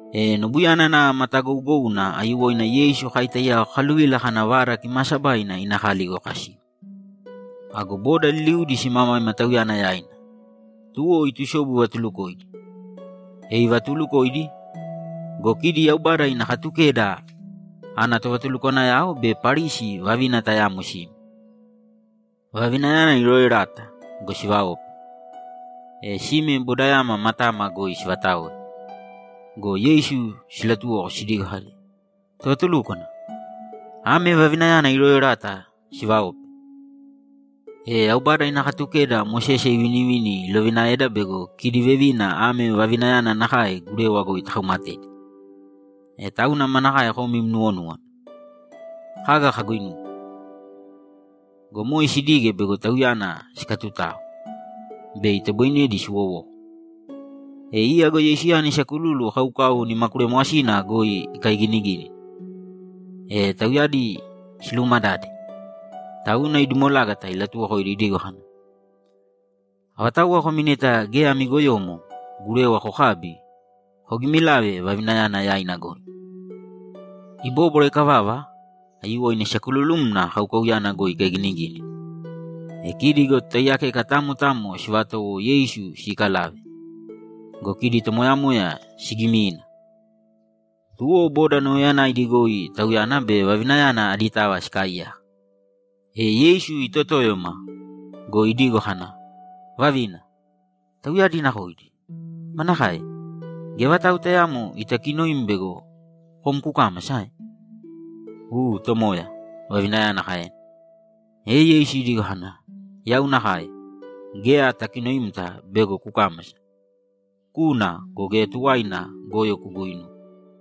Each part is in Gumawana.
E nobuyana nava matagougouna aiyuwoina Yeisu kai taiyao kakaluvila kana Vada Kimaasabaina ina kali goi kasiu. Ago boda liliudi simamaima Tauyana yaina, tuwo itusobu ivatulukoidi. E ivatuulukoidi go, kidi Yaubada ina Katukeda ana tovatulukwanayao be Parisi vavina tayamo sime. Vavinayana irooerata go, sivaope. E sime bodayama matama goi sivataoe go, Yeisu silatuwoko sidigo kadi, ‘Tovatulúkwana, ame vavinayana irooerata sivaope. E Yaubada ina Katukeda Mosese ivinivini ilovinaeda bego kidi vevina ame vavinayana nakae gurewa goi takaumatedi. E tauna manakae kom im nuwonúwana? Kaga kaguinuwe?’ Go moe sidige bego Tauyana sikatutao, bei itoboinedi siwowoko. E iya go Yeisuyana isakululu kaukau nimakulemwasina goi ikaiginigínina. E tauyadi siluumadade, tauna idumolágata ilatuwokoidi idigo kana, ‘Avatauwa komi neta geya ami goyomo, gurewa kokābi, kogimilāve vavinayana yaina goi.’ Ibóbwara ikavava, aiyuwoina isakululumna kaukauyana goi ikaiginigínina. E kidi go totaiyakeka tamo tamo sivatowo Yeisu siikalave go, kidi tomoyamoya sigimina. Tuwo boda nauyayanaidi goi Tauyana be vavinayana aditava sikaaiyaka. E Yeisu itotóyoma go, idigo kana, ‘Vavina, tauyadi nakoidi? Manakae? Geya vatau tayaamo itakinoim bego kom kukāmasa, ae?’ ‘U, Tomoya’, vavinayana kaena. E Yeisu idigo kana, ‘Yau nakae, geya atakinoimta bego kukāmasa. Kūna go, geya tuwaina goyo kuguuinūwe.’]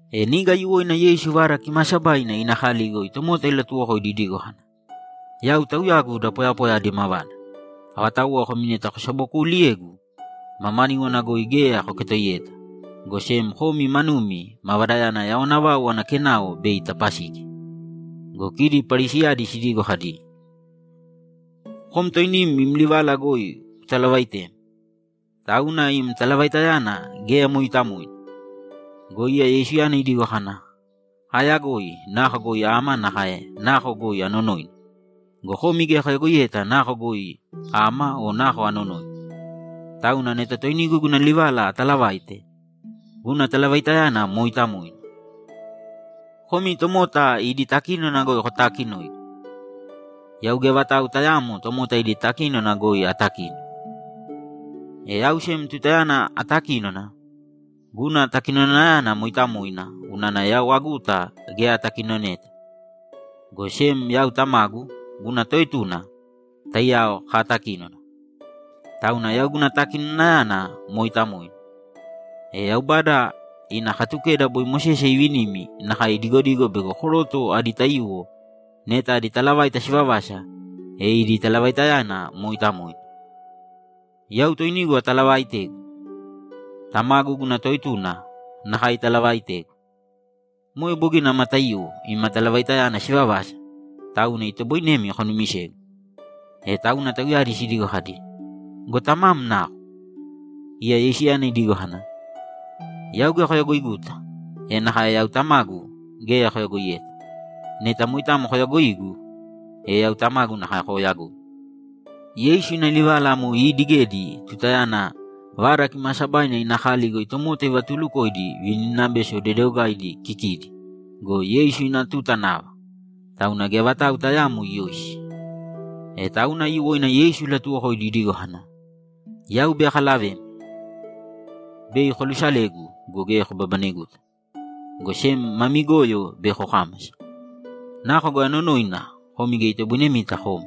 E niga aiyuwoina Yeisu Vada Kimaasabaina ina kali goi tomota ilatuwokoidi idigo kana, ‘Yau Tauyagu da poyapoya adi mavada. Avatauwa komi neta kosabokuuliyegu, mamaníwana goi geya koketoiyeta, go sem komi manumi mavadayana yawana vau ana kenao bei itapasigi.’ Go kidi Parisiyadi sidigo kadi, ‘Kom toinim im livala goi kutalavaitem. Tauna im talavaitayana geya mooitamoina.’ Go iya Yeisuyana idigo kana, ‘Aayagoi nako goi ama nakae nako goi anonoina go, komi geya koyagoiyeta nako goi ama o nako anonoina. Tauna neta toinigu guna livala ataalavaite, guna talavaitayana mooitamoina. Komi tomota idi takínona goi kotaakinoigu. Yau geya vatau tayaamo tomota idi takínona goi atakino. E yau sem tutayana atakínona, guna takinonayana mooitamoina unana yau aguta geya atakinoneta, go sem yau Tamagu, guna Toetuna, taiyao kaatakínona. Tauna yau guna takinonayana mooitamoina. E Yaubada ina Katukeda boi Mosese ivinimi nakae idigodigo bego koroto adi taiyuwo neta idi talavaita sivavasa, e idi talavaitayana mooitamoina. Yau toinigu atalavaaitegu. Tamagu, guna Toetuna, nakae italavaaitegu. Moe bogina ama taiyuwo ima talavaitayana sivavasa, tauna itoboinemi konumisegu.’ E tauna tauyadi sidigo kadi, ‘Go Tamam nako?’ Iya Yeisuyana idigo kana, ‘Yau geya koyagoiguta, e nakae yau Tamagu geya koyagoiyeta. Neta moitamo koyaagoigu, e yau Tamagu nakae kooyagoi.’ Yeisu ina livala amo iidigedi tutayana Vada Kimaasabaina ina kali goi tomota ivatuulukoidi vininabeso dedeogaidi kikidi go, Yeisu ina tuta nava, tauna geya vatau tayaamo iyoisi. E tauna aiyuwoina Yeisu ilatuwokoidi idigo kana, ‘Yau bei akalavemi. Bei kolusalegu go, geya kobabaneguta, go sem mami goyo bei kokámasa. Nako goi anonoina, komi geya itoboinemita koma.’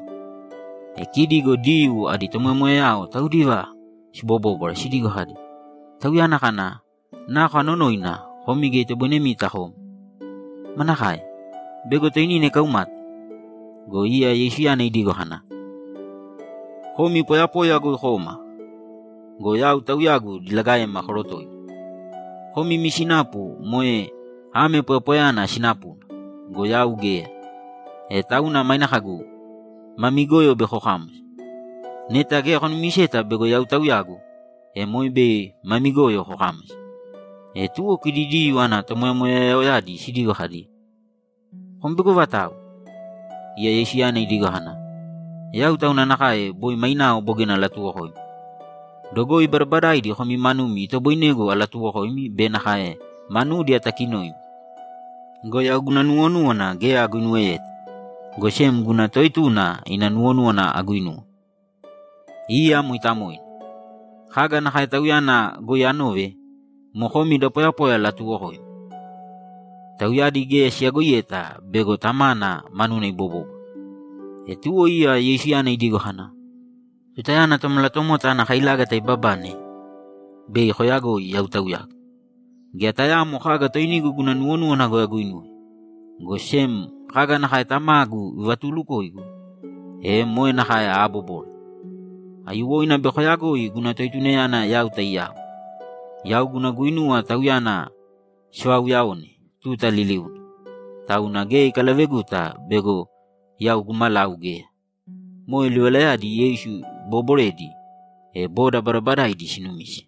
E kidi Diyuu idi tomoyamoyayao taudiva sibobóbwara sidigo kadi, ‘Tauyana kana, “Nako anonoina, komi geya itoboinemita koma.” Manakae? Bego toinina ikaumate?’ Go iya Yeisuyana idigo kana, ‘Komi poyapoya goi koma go, yau Tauyagu diligaema korotoigu. Komi imi sinapu moe ame poyapoyayana sinapuna go, yau geya. E tauna maine kagu, “Mami goyo bei kokámasa.” Neta geya konumiseta bego Yau Tauyagu, e moe bei mami goyo kokámasa.’ E tuwo kidi Diyuu idi tomoyamoyayaoyadi sidigo kadi, ‘Kom bego avatau?’ Iya Yeisuyana idigo kana, ‘Yau tauna nakae boi mainao bogina alatuuwokoimi. Dogoi badabadaidi komi manumi itoboinegu alatuwokoimi be nakae manudi atakinoimi go, yau guna nuwonúwana geya aguinuweyeta, go sem guna Toetuna ina nuwonúwana aguinuwe. Iya mooitamoina. Kaga nakae Tauyana goi anove, moe komi da poyapoya alatuwokoimi.’ Tauyadi geya siyagoiyeta bego Tamana manuna ibobóbwara. E tuwo iya Yeisuyana idigo kana, ‘Tutayana Tomalatomota ana kailágata ibabane, bei koyagoi Yau Tauyagu. Geya tayaamo kaga toinigu guna nuwonúwana goi aguinuwe, go sem kaga nakae Tamagu ivatuulukoigu, e moe nakae aabobore. Aiyuwoina bei koyagoi guna Toetunayana yau taiyao. Yau guna guinuwa Tauyana sivauuyaone tuta liliuna, tauna geya ikalaveguta bego yau gumalau geya.’ Moe livalayadi Yeisu ibooboredi, e boda badabadaidi sinumise.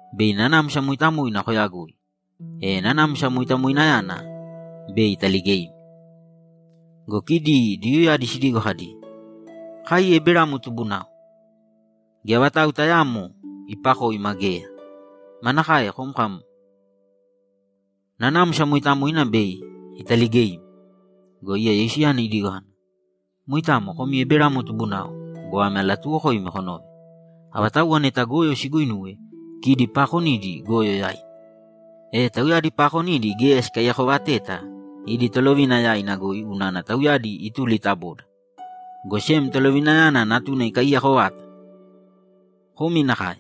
Bei Nanamsa Mooitamoina koyagoi, e Nanamsa Moitamoinayana bei italigeimi.’ Go kidi Diyuuyadi sidigo kadi, ‘Kai Eberamo tubunao. Geya vatau tayaamo ipakoima geya! Manakae kom kam, “Nanamsa Mooitamoina bei italigeimi”?’ Go iya Yeisuyana idigo kana, ‘Moitamo komi Eberamo tubunao go, ame alatuuwokoimi konōve: Avatauwa neta goyo siguuinuwe, kidi paakonidi goyo yaina. E tauyadi paakonidi geya sikaiyakovateta idi tolovina yaina goi unana tauyadi ituli ta boda, go sem tolovinayana natuna ikaiyako vata. Komi nakae.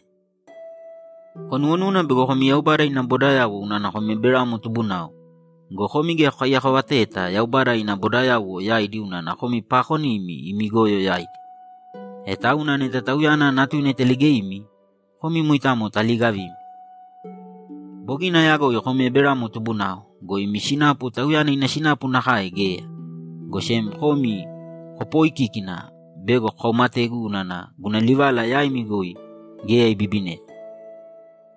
Konuwonúwana bego komi Yaubada ina bodayauwo unana komi Eberamo tubunao go, komi geya kokaiyakovateta Yaubada ina bodayauwo yaidi unana komi paakonimi imi goyo yaidi. E tauna neta Tauyana Natuna italigeimi, komi moitamo taliigavimi. Bogina ayagoi komi Eberamo tubunao go, imi sinapu tauyana ina sinapu nakae geya, go sem komi kopooikíkina bego kokaumategu unana guna livala yaimi goi geya ibibineta.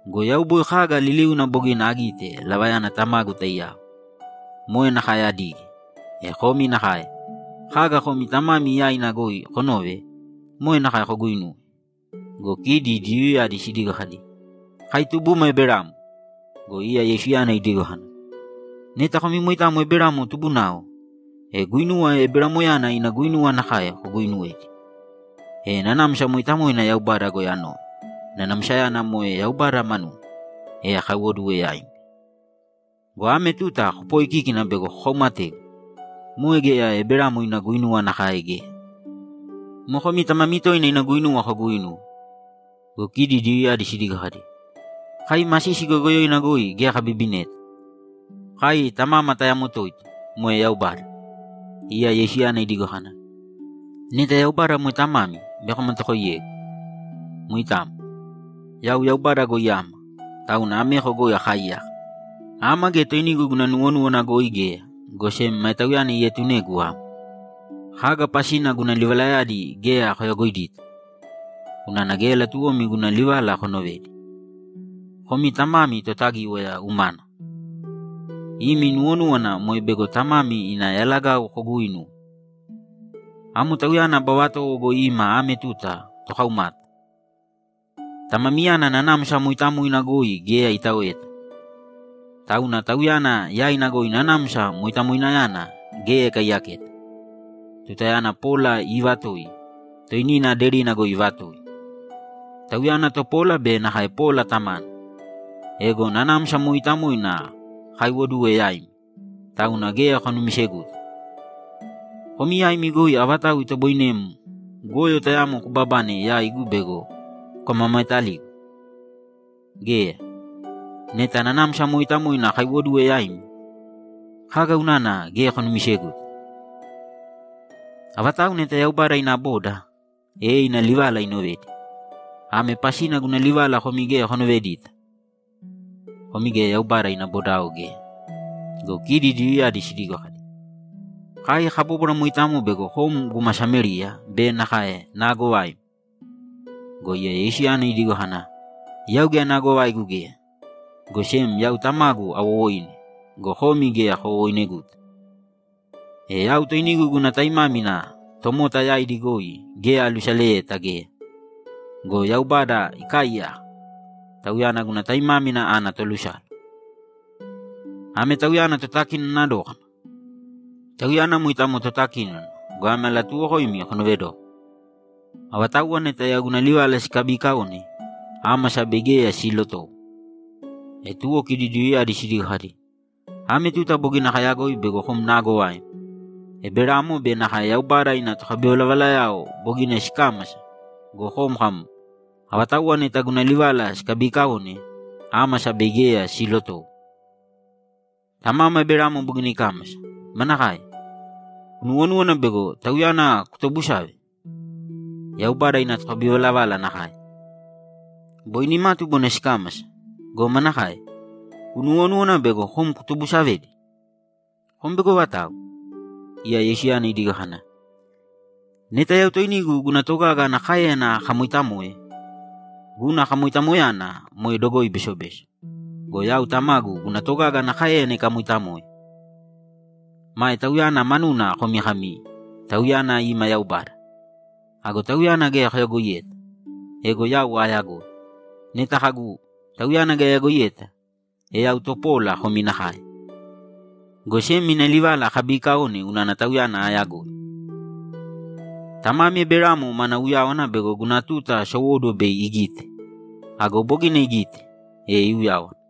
Go yau boi kaga liliuna bogina agite lavayana Tamagu taiyao, moe nakae adige. E komi nakae, kaga komi tamami yaina goi konove, moe nakae koguuinuwe.’ Go kidi Diyuuyadi sidigo kadi, ‘Kai tubuma Eberamo!’ Go iya Yeisuyana idigo kana, ‘Neta komi moitamo Eberamo tubunao, e guinuwa Eberamoyana ina guinuwa nakae koguuinuwedi. E Nanamsa Mooitamoina Yaubada goi anove, Nanamsayana moe Yaubada manuna, e akaiwoduwe yaimi. Go ame tuta kopooikíkina bego kokaumategu. Moe geya Eberamo ina guinuwa nakae geya. Moe komi tamami toina ina guinuwa koguuinuwe.’ Go kidi Diyuuyadi sidigo kadi, ‘Kai masisi goyogoyoina goi geya kabibineta. Kai tamama tayamo toito, moe Yaubada.’ Iya Yeisuyana idigo kana, ‘Neta Yaubada moe tamami, bei komatakoiyegu. Moitamo. Yau Yaubada goi ama, tauna ameko goi akaaiyaka. Ama geya toinigu guna nuwonúwana goi geya, go sem mae Tauyana ietunegu ama. Kaga pasina guna livalayadi geya koyagoidita? Unana geya latuwomi guna livala konovedi. Komi tamami Totagíwaya umana. Imi nuwonúwana moe bego tamami ina yalagau koguuinuwe. Amo tauyana aba vatowo goi ima ame tuta tokaumata. Tamamiyana Nanamsa Mooitamoina goi geya itaoeta, tauna tauyana yaina goi Nanamsa Moitamoinayana geya ikaiyaketa. Tutayana pola iivatoi, toinina aderina goi ivatoi. Tauyana topola be nakae pola tamana. Ego Nanamsa Mooitamoina akaiwoduwe yaimi, tauna geya konumiseguta. Komi yaimi goi avatau itoboinem goyo tayamo kubabane yaigu bego kukamamaetaligu? Geya. Neta Nanamsa Mooitamoina akaiwoduwe yaimi, kaga unana geya konumiseguta? Avatau neta Yaubada ina boda, e ina livala inovedi. Ame pasina guna livala komi geya konovedita: Komi geya Yaubada ina bodao geya.’ Go kidi Diyuuyadi sidigo kadi, ‘Kai kabóbwara moitamo bego kom guma Samériya be nakae naagovaim!’ Go iya Yeisuyana idigo kana, ‘Yau geya naagovaigu geya, go sem yau Tamagu awowoine go, komi geya kowowoineguta. E yau toinigu guna taimámina tomota yaidi goi geya alusaleyeta geya. Go Yaubada ikaaiyaka, Tauyana guna taimámina ana tolusala. Ame Tauyana totakinona dókana. Tauyana moitamo totakínona go, ame alatuuwokoimi konoovedōko: Avatauwa neta yau guna livala sikabiikaone, ámasa bei geya siilotowo.’ E tuwo kidi Diyuuyadi sidigo kadi, ‘Ame tuta bogina kayagoi bego kom naagovaim. Eberamo be nakae Yaubada ina tokabivalavalayao bogina sikámasa go, kom kam, “Avatauwa neta guna livala sikabiikaone, ámasa bei geya siilotowo.” Tamama Eberamo bogina ikámasa. Manakae? Kunuwonúwana bego tauyana kutobusave? Yaubada ina tokabivalavala nakae. Boi nimatu bogina sikámasa go, manakae? Kunuwonúwana bego kom kutobusavedi? Kom bego avatau?’ Iya Yeisuyana idigo kana, ‘Neta yau toinigu guna togaga ana káeyana akamoitamoe, guna kamoitamoyana moe dogoi besobeso. Go yau Tamagu guna togaga ana káeyana ikamoitamoe. Mae Tauyana manuna komi kami, “Tauyana ima Yaubada.” Ago Tauyana geya koyagoiyeta. Ego yau aayagoi. Neta kagu, “Tauyana geya ayagoiyeta”, e yau topola komi nakae, go sem ina livala akabiikaone unana Tauyana aayagoi. Tamami Eberamo mana uyáwana bego guna tuta sowóduwo bei igite. Ago bogina igite, e iuyáwana.’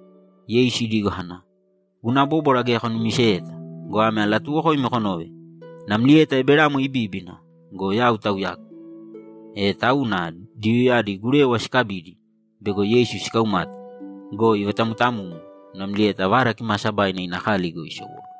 Yeisu idigo kana, ‘Guna bóbwara geya konumiseyeta go, ame alatuuwokoimi konōve: Namlieta Eberamo ibíbina go, Yau Tauyagu.’ E tauna Diyuuyadi gurewa sikabidi, bego Yeisu sikaumate go, ivatamutamumu namlieta Vada Kimaasabaina ina kali goi isowóduwo.